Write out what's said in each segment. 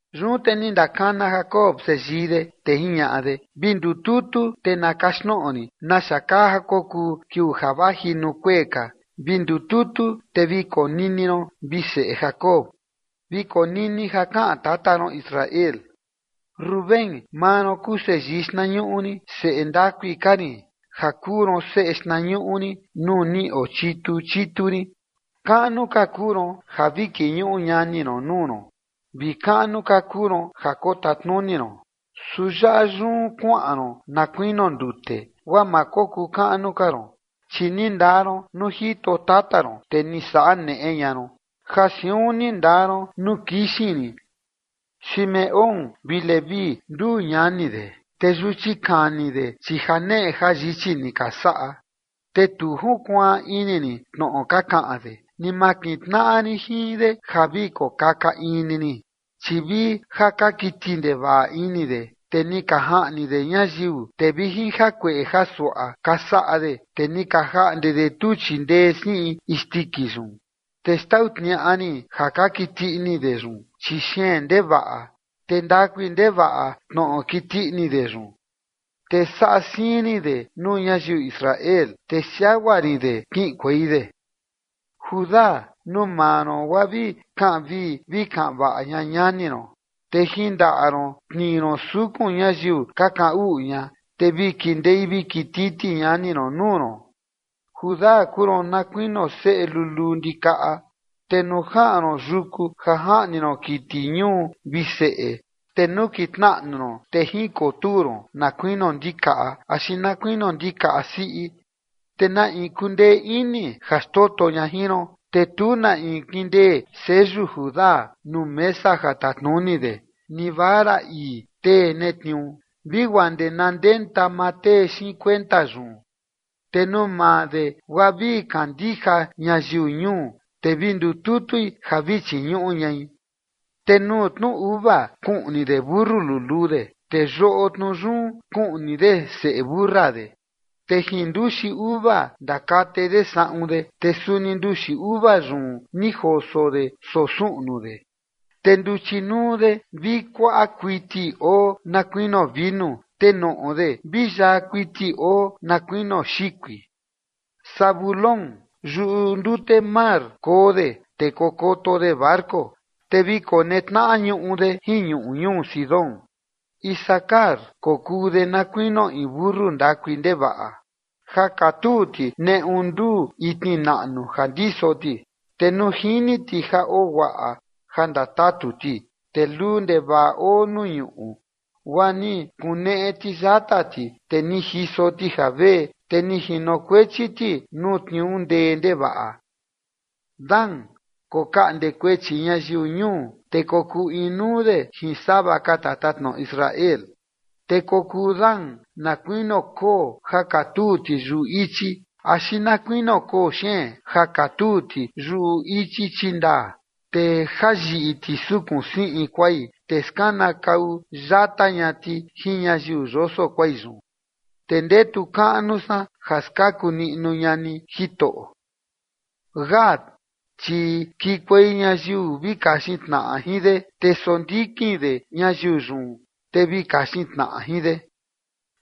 Yun te ni ndakana Jacob seyii de, te jiñaꞌa de: ―Vi ndututu te na kaxtnoꞌo rin naxa kaa ja kokuu kiuu ja vaji nuu kuee ka. Vi ndututu te vi konini ron, vi seꞌe Jacob, Vi konini ja kaꞌan tata ron Israel. Rubén, maa ron kuu seyii xtnañuꞌu rin, seꞌe ndakui ka rin ja kuu ron seꞌe xtnañuꞌu rin nuu ni ochitu chitu rin. Kaꞌnu ka kuu ron ja vi kiñuꞌu ñani ron nuu ron, vi kaꞌnu ka kuu ron ja kotatnuni ron. Su yaꞌa yun kuaꞌan ron na kuinio ndute guaa ma kokuu kaꞌnu ka ron, chi ni ndaa ron nuu jito tata ron, te ni saꞌa neꞌe ña ron, ja siun ni ndaa ron nuu kixin rin. Simeón vi Leví, nduu ñani de, te yuchi kani de, chi ja janeꞌe jayichi ni ka saꞌa. Te tu junkuaan ini rin tnoꞌo ka kaꞌan de, ni ma kintnaꞌa rin jin de ja vi kokaka in ni rin, chi vi ja ka kiti ndevaꞌa ini de, te ni ka jaꞌni de ñayiu. Te vi jin jakueꞌe jasuaꞌa ka saꞌa de, te ni ka jaꞌnde de tuchi ndee siꞌin isndiki yun. Te xtau tniaꞌa rin ja ka kiti ini de yun, chi xeen ndevaꞌa, te ndakui ndevaꞌa tnoꞌo kiti ini de yun, te saꞌa siin rin de nuu ñayiu Israel, te siagua rin de kiꞌinkuei de. Judá, nuu maa ron guaa vi kaꞌan vii vi kaꞌan vaꞌa ña ñani ron, te jin ndaꞌa ron tnii ron sukun ñayiu ka kaꞌan uꞌu ña, te vi kindei vi kititi ñani ron nuu ron. Judá, kuu ron na kuinio seꞌe luluu ndikaꞌa, te nuu jaꞌan ron yuku ja jaꞌni ron kiti ñuu, vi seꞌe, te nukitnaꞌnu ron te jikotuu ron na kuinio ndikaꞌa, axi na kuinio ndikaꞌa siꞌi, ¿te na in kundee ini ja xtoto ña jin ron? Te tu na in kindee seyu Judá nuu mesa ja tatnuni de, ni vara ii tee netniuu, vi guaa ndee na ndenta maa tee xiin kuenta yun. Te nuu maa de guaa vi kandija ñayiu ñuu te vi ndututui ja vi chiñuꞌu ñai. Te nuu tnu uva kuꞌni de mentu luluu de, te yoꞌo tnu yun kuꞌni de seꞌe mentu siꞌi de, te jin nduxi uva ndakate de saꞌun de, te suni nduxi uva yun ni joso de soo suꞌnu de. Te nduchi nuu de vi kuaꞌa kuiti oo na kuinio vinu, te noꞌo de vi yaa kuiti oo na kuinio xikui. Zabulón, yuꞌu ndute mar koo de te kokoto de barco te vi konetnaꞌa ñuꞌu de jin ñuꞌu ñuu Sidón. Isacar, kokuu de na kuinio in mentu ndakui ndevaꞌa ja katuu ti neꞌu nduu itni naꞌnu ja ndiso ti. Te nuu jini ti ja oo guaꞌa ja ndatatu ti te luu ndevaꞌa oo nuu ñuꞌu guaa ni kuneꞌe ti yata ti te ni jiso ti javee te ni jinokuechi ti nuu tniuu ndee ndevaꞌa. Dan kokaꞌnde kuechi ñayiu ñuu te kokuu inuu de jin sava ka tatatnoꞌo Israel. Te kokuu Dan na kuinio koo ja katuu ti yuꞌu ichi axi na kuinio koo xeen ja katuu ti yuꞌu ichi chindaa, te jayiꞌi ti sukun siꞌin kuai te skanakau yata ña ti jin ñayiu yoso kuai yun. Te ndetu kaꞌnu san ja skaku niꞌnu ña ni, Jitoꞌo. Gad, chi kikuei ñayiu vi kaxin tnaꞌa jin de, te sondikin de ñayiu yun te vi kaxin tnaꞌa jin de.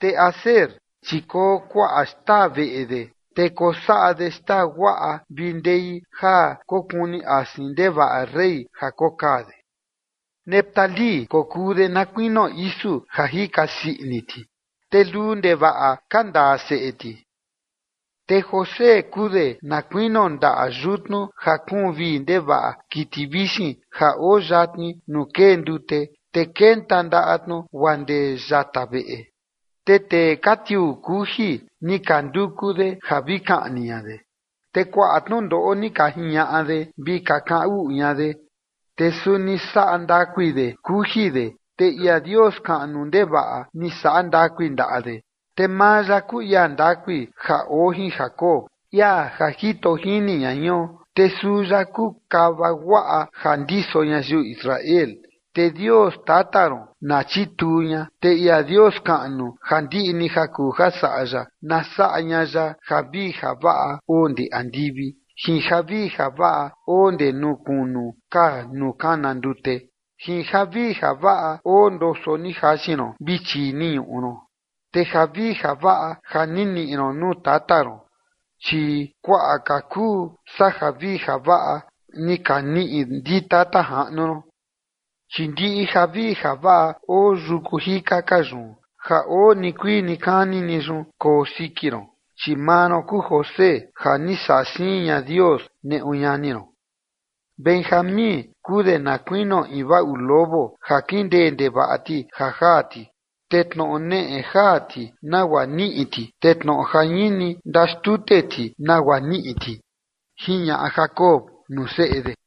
Te Aser, chi koo kuaꞌa xtaa veꞌe de te kosaꞌa de xtaa guaꞌa vi ndei ja kokuni asin ndevaꞌa rey ja kokaa de. Neftalí, kokuu de na kuinio isu ja jika sii ini ti, te luu ndevaꞌa ka ndaa seꞌe ti. Te José kuu de na kuinio ndaꞌa yutnu ja kuun vii ndevaꞌa kiti vixin ja oo yatni nuu kee ndute te kenta ndaꞌa tnu guaa ndee yata veꞌe. Te tee ja ka tiuu kuji ni ka nduku de ja vi kaꞌni ña de, te kuaꞌa tnundoꞌo ni ka jiñaꞌa de vi ka kaꞌan uꞌu ña de. Su ni saꞌa ndakui de kuji de, te ia Dios kaꞌnu ndevaꞌa ni saꞌa ndakui ndaꞌa de, te maa ya kuu ia ndakui ja oo jin Jacob, ia ja jito jini ña jion. Te suu ya kuu kava guaꞌa ja ndiso ñayiu Israel. Te Dios tata ron na chituu ña, te ia Dios kaꞌnu, ja ndiꞌi ni ja kuu saꞌa ya, na saꞌa ña ya javii javaꞌa oo ndee andivi, jin javii javaꞌa oo ndee nuu kunu ka nuu kana ndute, jin javii javaꞌa oo ndoso ni jaxin ron vi chii ni ñuꞌu ron. Te javii javaꞌa ja ni niꞌi ron nuu tata ron, chi kuaꞌa ka kuu saa javii javaꞌa ni ka niꞌi ndi tata jaꞌnu rin, chi ndiꞌi javii javaꞌa oo yuku jika ka yun ja oo nikuii nikani ni yun koo siki ron, chi maa ron kuu José, ja ni saꞌa siin ña Dios neꞌu ñani ron. Benjamín, kuu de na kuinio in vaꞌu lobo ja kindee ndevaꞌa ti ja jaa ti, te tnoꞌo neꞌe jaa ti nagua niꞌi ti, te tnoꞌo jañini ndaxtute ti nagua niꞌi ti. ―Jiñaꞌa Jacob nuu seꞌe de.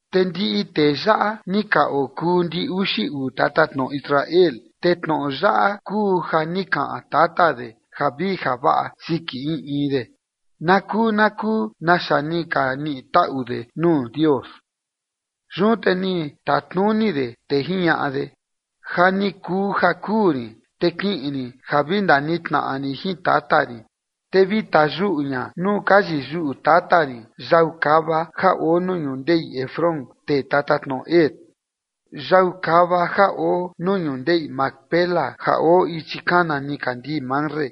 Te ndiꞌi tee yaꞌa ni ka okuu ndi uxi uu tatatnoꞌo Israel, te tnoꞌo yaꞌa kuu ja ni kaꞌan tata de javii javaꞌa siki in in de, na kuu na kuu naxa ni ka niꞌi taꞌu de nuu Dios. Yun te ni tatnuni de, te jiñaꞌa de: ―Ja ni kuu ja kuu rin, te kiꞌin rin ja vi ndanitnaꞌa rin jin tata rin, te vi tayuꞌu ña nuu ka yiyuꞌu tata rin yau kava ja oo nuu ñundeꞌi Efrón tee tatatnoꞌo Het, yau kava ja oo nuu ñundeꞌi Macpela ja oo ichi kana nikandii Mamre,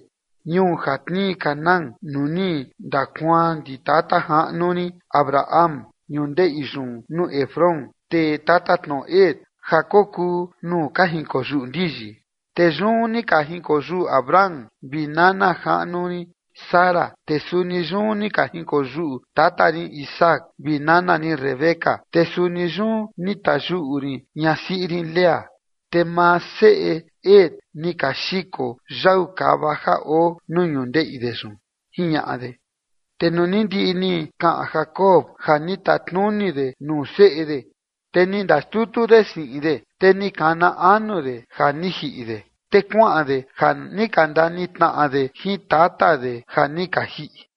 ñuu ja tnii Canaán, nuu ni ndakuaan ndi tata jaꞌnu rin Abraham ñundeꞌi yun nuu Efrón tee tatatnoꞌo Het ja kokuu nuu ka jinkoyuꞌu ndiyi. Te yun ni ka jinkoyuꞌu Abraham vi nana jaꞌnu rin Sara, te suni yun ni ka jinkoyuꞌu tata rin Isaac vi nana rin Rebeca, te suni yun ni tayuꞌu rin ñasiꞌi rin Lea. Te maa seꞌe Het ni ka xiko yau kava ja oo nuu ñundeꞌi de yun ―jiñaꞌa de. Te nuu ni ndiꞌi ni kaꞌan Jacob ja ni tatnuni de nuu seꞌe de, te ni ndaxtutu de siꞌin de, te ni kana anu de, ja ni jiꞌi de, te kuaꞌan de ja ni ka ndanitnaꞌa de jin tata de ja ni ka jiꞌi.